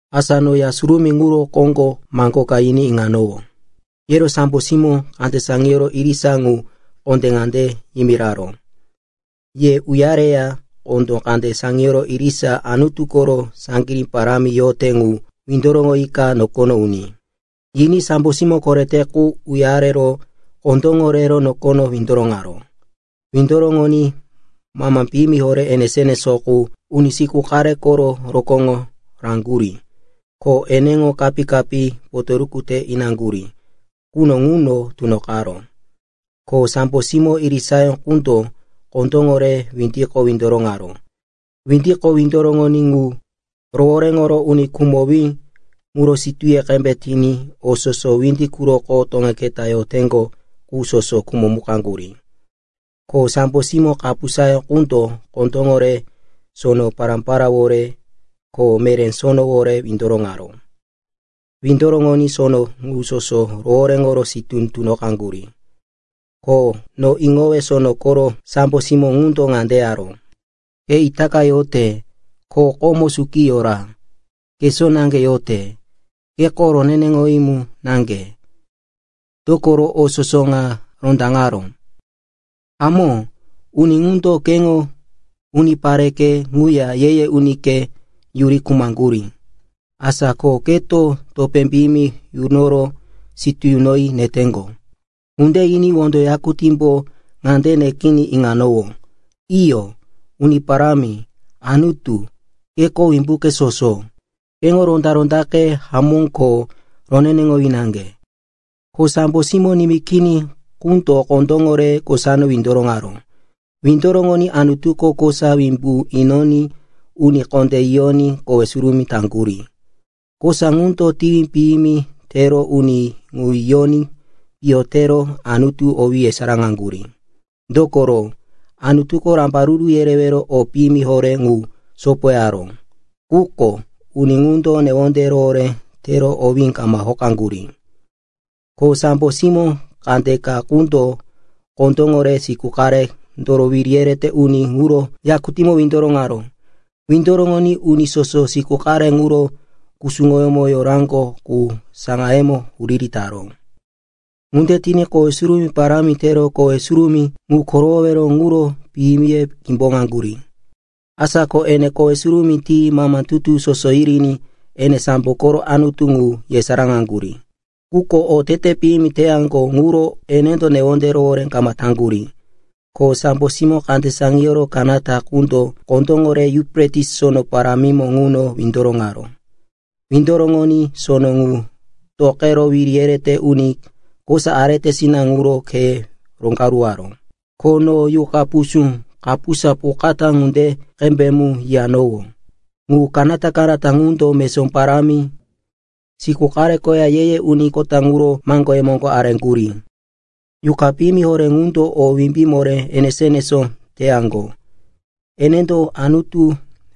Asa no Ya Surumí ŋuro koŋgo maŋgo ka yiní iŋanowó. Yero sambo simó kande saŋiyoro irisa ŋu kondé ŋande yimiraró, “Ye uya reya kondó kande saŋiyoro irisa Anutu koro saŋgirí parámi yote ŋu windoroŋoyika nokono uní!” Yiní sambo simó korete qundo uyaro kondóŋo re nokono windoroŋaró. Windoroŋoní mama piyimi horé enesó-enesó quko uni siku qare koro rokóŋo raŋgurí, ko eneŋo kapí-kapí potoruku te inaŋgurí quno ŋuno tunoqaró. Ko sambo simó irisayó qundo kondóŋo re windiko windoroŋaró. Windoroŋoní windi ŋu rohoréŋoro uni khumowí muro sitúye qembe tiní o soso windi quroko toŋe keta yoteŋgo qu soso khumomukaŋgurí. Ko sambo simó kapusayó qundo kondóŋo re sono pará-paráwore, ko meré sonowore windoroŋaró. Windoroŋoní sono ŋu soso rohoréŋoro sitú tunoqaŋgurí. Ko no iŋowe sono koro sambo simó ŋundo ŋande yaró, “Ke itaka yote, ko komo suki yora, kesó naŋge yote. Keko roneneŋowí mu naŋge, dokoro o soso ŋa rondaŋaró. Hamó, uni ŋundo keŋo unipareke ŋuya ye-ye unike yuri khumaŋgurí. Asa ko keto topé piyimi yunoro sitú yunoyi neteŋgo.” Ŋunde yiní wondo yakutímbo ŋande nekiní iŋanowó, “Iyo, Uni Parámi, Anutu, keko Wimbuke Soso. Keŋo ronda-rondake hamó ko roneneŋowí naŋge.” Ko sambo simó nimí kini qundo kondóŋo re kosako windoroŋaró. Windoroŋoní Anutuko kosa wimbu inoní uni kondé yiyoní kowe surumí taŋgurí. Kosa ŋundo tiwi piyimi tero uni ŋu yoqaní piyo tero Anutu owí yesaráŋaŋgurí, dokoro Anutuko rambaruru yerewero o piyimi horé ŋu sopoyaró. Quko uni ŋundo newonde rohoré tero owí kama hokaŋgurí. Ko sambo simó kandeka qundo kondóŋo re siku qarendoro wiri yerete uni ŋuro yakutímo windoroŋaró. Windoroŋoní uni soso siku qare ŋuro kusuŋoyómo yoraŋgo qu saŋayemo huriri taró. Ŋunde tiní kowe surumí parámi tero kowe surumí ŋu korowowero ŋuro mipiye kimboŋaŋgurí. Asa ko ene kowe surumí ti mama tutu soso yiriní ene sambo koro Anutu ŋu yesaráŋaŋgurí. Quko otete piyimi teyaŋgo ŋuro ene newonde rohoré kama taŋgurí. Ko sambo simó kande saŋiyoro kanata qundo kondóŋo re Yufretis Sono parámimo ŋuno windoroŋaró. Windoroŋoní sono ŋu toqero wiri yerete uni kosa aretesina ŋuro kheye roŋgaruwaró. Ko no yuqa pusú kapusa pukatá ŋunde qembe mu yiyanowó. Ŋu kanata-kanata ŋundo mesó parámi, siku qare ko ye-ye uni kota ŋuro maŋgoye moŋgo areŋgurí. Yuqa piyimi horé ŋundo o wimbí moré enesó-enesó teyaŋgo. Enendo Anutu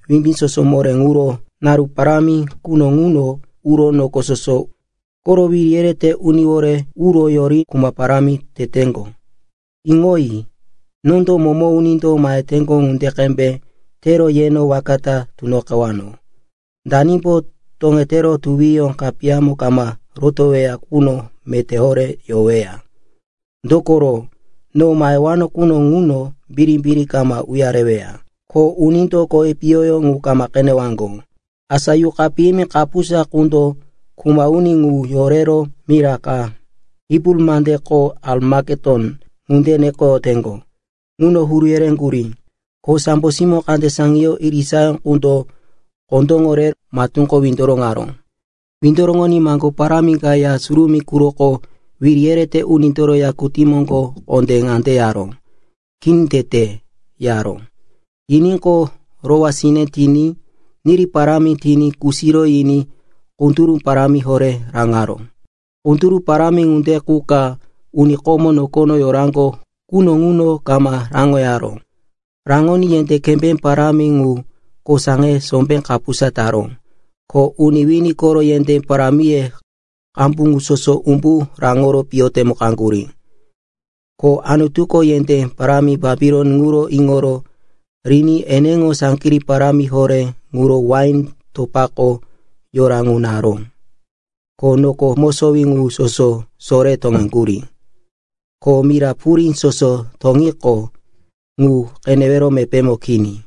Wimbí Soso Moré ŋuro naru parámi quno ŋuno uro noko soso koro wiri yerete uniwore uro yori kuma parámi teteŋgo. (“Iŋoyi! Nondo momo unindo maheteŋgo ŋunde qembe tero yeno waka ta tunoqewano. Danimbo toŋetero tuwiyó kapiyamo kama rotoweya qundo meté horé yoweya. Dokoro no mahewano quno ŋuno birimbiri kama uyareweya, ko unindo kowi piyoyó ŋu kama qenewaŋgo.”) Asa yuqa piyimi kapusa ŋundo kuma uni ŋu yorero mira ka, Hibru mandeko Arimaketon ŋunde nekoyoteŋgo, ŋuno huru yereŋgurí. Ko sambo simó kande saŋiyoro irisayó qundo kondóŋo re matúko windoroŋaró. Windoroŋoní maŋgo parámi ka Ya Surumí quroko wiri yerete unindoro yakutí moŋgo kondé ŋande yaró, “Kini tete!” yaró. Yiníqo, rowá sine tiní niri parámi tiní kusiro yiní kunduru parámi horé raŋaró. Kunduru parámi ŋunde qu ka uni komo nokono yoraŋgo quno ŋuno kama raŋoyaró. Raŋoní yendé kembé parámi ŋu kosaŋe sombé kapusa taró, ko uni wini koro yendé parámiye qambu ŋu soso umbu raŋoro piyo temukaŋgurí. Ko Anutuko yendé parámi Bapilon ŋuro iŋoro riní eneŋo saŋgirí parámi horé ŋuro wain topako yora ŋu naró. Ko noko mosowí ŋu soso sore toŋeŋgurí, ko mira purí soso toŋiqo, ŋu qenewero mepémo kini.